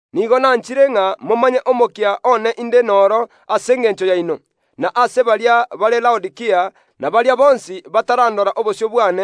Nigo nkobamanyia igoro y’omokia inde noro ase engencho yaino, boigo na ase abanto bare Laodikia na baria bonsi batarandora obosio bwane,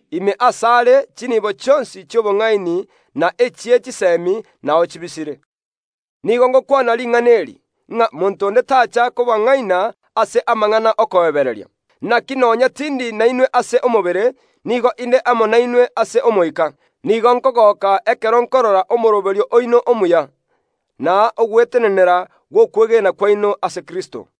Nere ekeigorero ase chinibo chionsi chi’obong’aini na echie chisemi chibisire. Nigo ngokwana ring’ana eri, ng’a monto onde tacha kobang’aina ase amang’ana okoebereria neisa koba nigo bare abaya. Naki nonya tindi nainwe ase omobere, nigo inde amo nainwe ase omoika. Nigo nkogoka ekero nkorora omoroberio oino omuya, na ogwetenenera gw’okwegena kwaino ase Kristo.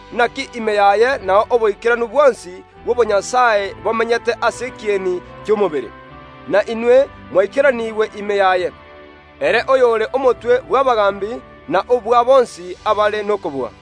Naki ime yaye nao oboikeranu bwonsi bw’obonyasae bomenyete ase ekieni ki’omobere. Na inwe mwaerwe obogima ime yaye, ere oyore omotwe bw’abagaambi na obwa bonsi abare nokobua.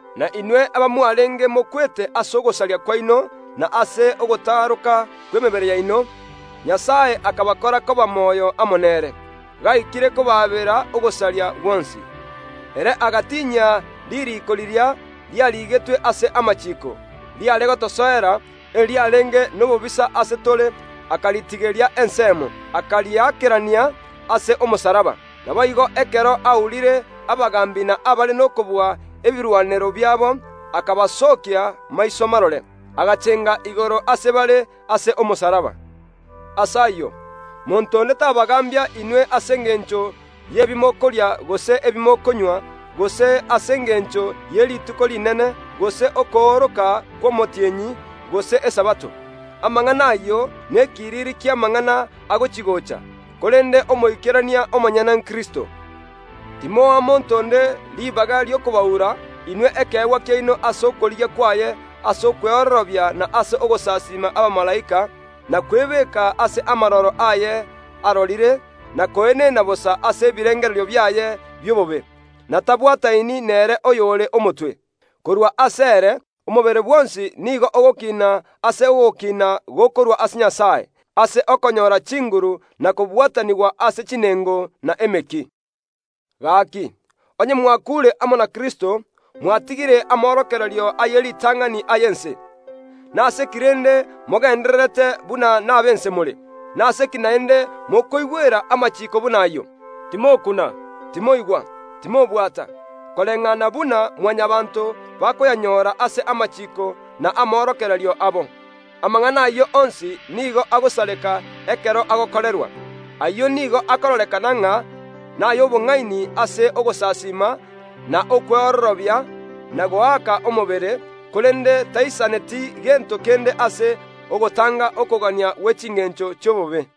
Na inwe abamwarenge mokwete ase ogosaria kwaino na ase ogotaroka kw’emebere yaino, Nyasae akabakora koba moyo amo nere, gaikire kobaabera ogosaria gwonsi. Ere agatinyia ririiko riria riarigetwe ase amachiiko, riare gotosoera, eriarenge nobobisa ase tore; akaritigeria ensemo, akariakerania ase omosalaba. Naboigo ekero aurire abagaambi na abare nokobua ebirwanero biabo, akabasookia maiso marore, agachenga igoro ase bare ase omosalaba oria. Ase ayio, timwancha koegwa ogochika inwe ase engencho y’ebimokoria gose ebimokonywa, gose ase engencho ye Rituko Rinene, gose okooroka kw’omotienyi, gose Esabato. Amang’ana ayio nekiriri ki’amang’ana agochi‐gocha, korende omoikerania omonyene nere Kristo. Timoa monto onde ribaga ri’okobaura inwe ekeegwa kiaino ase okorigia kwaye ase okweororobia na ase ogosasiima abamalaika, na kwebeka ase amaroro aya arorire, na koenena bosa ase ebirengererio biaye bi’obobe, na tabwataini nere oyore Omotwe. Korwa asere omobere bwonsi nigo ogokina ase ogokina gokorwa ase Nyasae, ase okonyora chinguru na kobwatanigwa ase chinengo na emeki. Gaki, onye mwakuure amo na Kristo, mwatigire amorokererio aye ritang’ani ay’ense, nase ki rende mogendererete buna nab’ense more? Nase ki naende mokoigwera amachiiko buna ayio: “Timokuna, Timoigwa, Timobwata”, koreng’ana buna Mwanyabaanto bakoyanyora ase amachiiko na amorokererio abo? (Amang’ana ayio onsi nigo agosareka ekero agokorerwa.) Ayio nigo akororekana ng’a nay’obong’aini ase ogosasiima na okweororobia na goaka omobere, korende taisaneti gento kende ase ogotanga okogania gwe chingencho chi’obobe.